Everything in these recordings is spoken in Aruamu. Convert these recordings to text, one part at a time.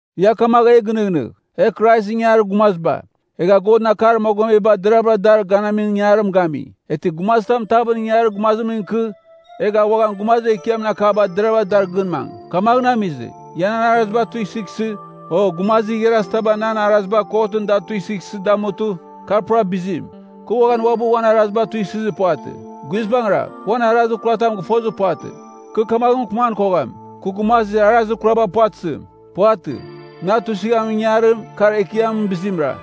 Ia kamagh e gɨnɨghnɨgh, e Kraisɨn ingangarir gumaziba. Egha Godɨn akar mogomeba deraghvɨra dar ganamim ingangarim gami. Eghtɨ gumazitam tavɨn ingangarir gumazimɨn ikɨ, egh a uan gumazir ekiamɨn akaba deraghvɨra dar gɨn mangɨ. Kamaghɨn amizɨ, ia nan araziba tuisɨghsɨ, o gumazir igharazitaba nan araziba kotɨn da tuisɨghsɨ damutɨ, kar pura bizim. Kɨ uaghan uabɨ uan araziba tuisɨzir puvatɨ. Guizbangɨra, kɨ uan arazir kuratam gɨfozir puvatɨ. Kɨ kamaghɨn mɨkɨman kogham, “Kɨ gumazir arazir kuraba puvatɨzim.” Puvatɨ, na tuisɨghamin ingangarim, kar Ekiamɨn bizimra.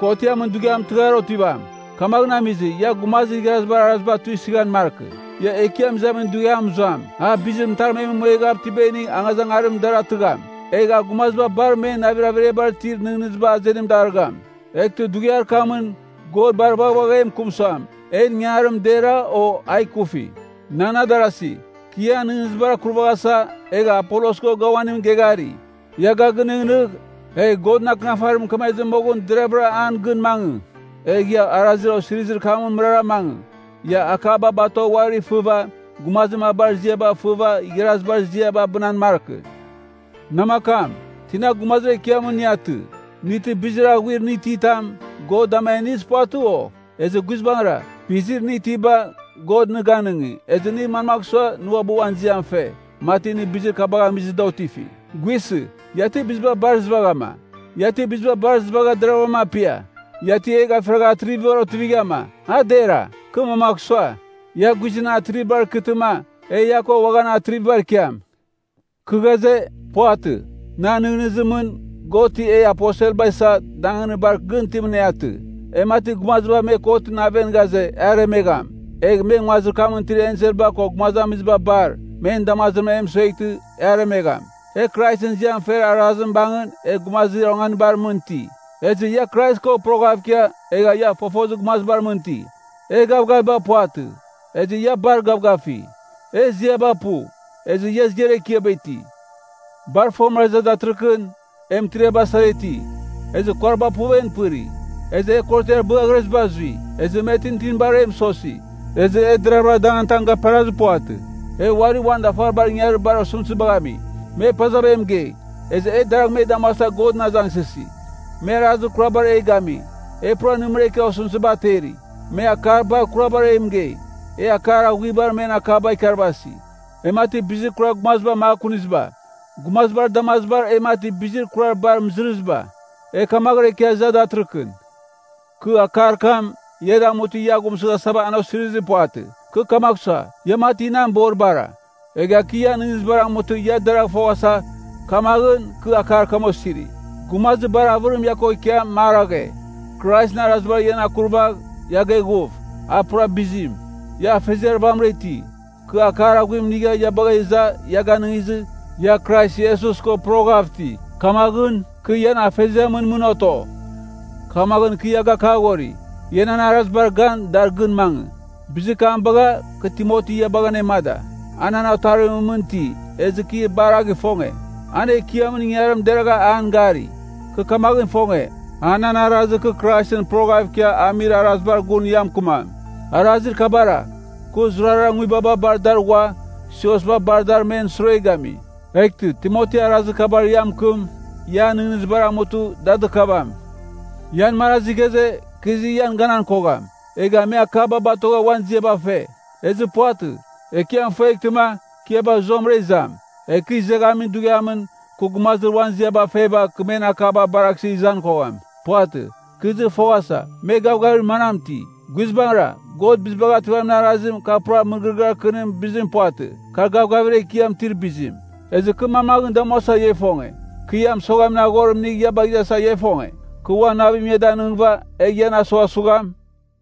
Kotiamɨn Dughiam tɨghar otivam. Kamaghɨn amizɨ, ia gumazir igharazibar araziba tuisɨghan markɨ. Ia Ekiam izamin dughiam mɨzuam. A bizir mɨtarmemɨn mueghav itiba inigh angazangarimɨn dar atɨgham. Egh a gumaziba bar men navir averiabar itir nɨghnɨziba, azenim darɨgham. Eghtɨ dughiar kamɨn, God bar vaghvagh e mɨkɨm suam, en ingangarim dera, o a ikufi. Nan adarasi, kɨ ian nɨghnɨzibar akurvaghasa, egha Apolos ko ga uaning geghari. Ia ga gɨnɨghnɨgh, egh Godɨn Akɨnafarim mɨkemezɨ moghɨn deravɨra an gɨn mangɨ. Egh ia arazir osirizir kamɨn mɨrara mangɨ. Ia akaba batogh uari fɨva, gumazir mabar ziaba fɨva igharazibar ziaba abɨnan markɨ. Namakam, tina gumazir ekiamɨn nɨ atɨ? Nɨ ti bizir aghuir nɨ ititam, God dama a inizir puvatɨ, o? Ezɨ guizbangɨra, bizir nɨ itiba, God nɨ ganɨngi, ezɨ nɨ manmagh sua nɨ uabɨ uan ziam fe, mati nɨ bizir kabagh amizɨ, da otifi? Guisɨ, ia ti biziba bar izɨvaghama? Ia ti biziba bar izɨvagha deraghavram apia? Ia ti e gafiragha atrivibar otivighama? A dera, kɨ mamagh sua, ia guizɨn atrivibar ikɨtɨma, e ia ko uaghan atrivibar ikiam. Kɨ ghaze, puvatɨ. Nan nɨghnɨzimɨn, God ti e aposelba isa, danganir bar gɨn itimɨn e atɨ. E mati gumaziba me kotɨn aven ghaze, e aremegham, egh me nguazir kamɨn itir enselba ko gumazamiziba bar, men damazimɨn e mɨsueghtɨ, e aremegham. E Kraisɨn ziam fer arazim bangɨn, e gumazir onganibar mɨn iti. Ezɨ ia Krais ko poroghav ikia, egha ia fofozir gumazibar mɨn iti. E gavgaviba puvatɨ, ezɨ ia bar gavgafi. E ziaba pu, ezɨ ia ziar ekiaba iti. Bar fomɨra iza datɨrɨkɨn, e mɨtiriaba sara iti, ezɨ kuariba puv en pɨri, ezɨ e korotiar bɨaghreziba azui. Ezɨ me tintinibar e mɨsosi. Ezɨ e deravɨra danganitam gaperazir puvatɨ. E uari uan dafaribar ingangarir bar osɨmtɨzibagh ami. Me pazava e mɨgei, ezɨ e deragh me damuasa Godɨn azangsɨsi. Me arazir kurabar e gami, e pura nɨmɨra ikia osɨmtɨziba ateri. Me akar bar kurabar e mɨgei, e akar aghuaribar men akaba ikarvasi. E mati bizir kurar gumaziba makuniziba. Gumazibar damazibar e mati bizir kurar bar mɨzɨrɨziba. E kamaghɨra ikia iza datɨrɨkɨn. Kɨ akar kam, ia damutɨ ia aghumsɨghasa an osirizir puvatɨ. Kɨ kamagh sua, ia mati nan boribara. Egha kɨ ian nɨghnɨzibar amutɨ ia deragh foghasa. Kamaghɨn, kɨ akar kam osiri. Gumazir bar avɨrim ia ko ikiam maraghe, Kraisɨn arazibar ian akurvagh, ia geghuf, a pura bizim. Ia afeziar vamɨra iti. Kɨ akar aghuim inigha ia bagha iza ia ganɨngizɨ, ia Krais Iesus ko poroghav iti. Kamaghɨn, kɨ ian afeziamɨn mɨn oto. Kamaghɨn kɨ ia gakaghori, ia nan arazibar gan, dar gɨn mangɨ. Bizir kam bagha, kɨ Timoti ia bagha anemada. A nan otarimɨn mɨn iti, ezɨ kɨ bar a gɨfonge. An Ekiamɨn ingangarim deragha an gari. Kɨ kamaghɨn ifonge, a nan arazir kɨ Kraisɨn poroghav ikia amir arazibar gun ia mɨkɨmam. Arazir kabara, kɨ zurara nguibaba bar dar ghua, siosba bar dar men sure gami. Eghtɨ, Timoti arazir kabar ia mɨkɨm, ian nɨghnɨzibar amutɨ, da dɨkavam. Ian marazi ghaze, kɨ izɨ ian ganan kogham, egha me akaba batogha uan ziaba fe. Ezɨ puvatɨ. Ekiam ifueghtɨma, kɨ ia bagh zuamɨra izam. Egh kɨ izeghamin dughiamɨn, kɨ gumazir uan ziaba feba, kɨ men akaba baraghsɨ izan kogham. Puvatɨ. Kɨ izɨ foghasa, me gavgavir manam iti. Guizbangɨra, God Bizibagh Ativamin Arazim, kar pura mɨgɨrɨgɨar kɨnimɨn bizim puvatɨ. Kar gavgavir ekiam itir bizim. Ezɨ kɨ manmaghɨn damuasa ia ifonge? Kɨ ia mɨsoghamin aghorim inigh ia bagh izasa, ia ifonge? Kɨ uan navim ia danɨngɨva, egh ian asughasugham?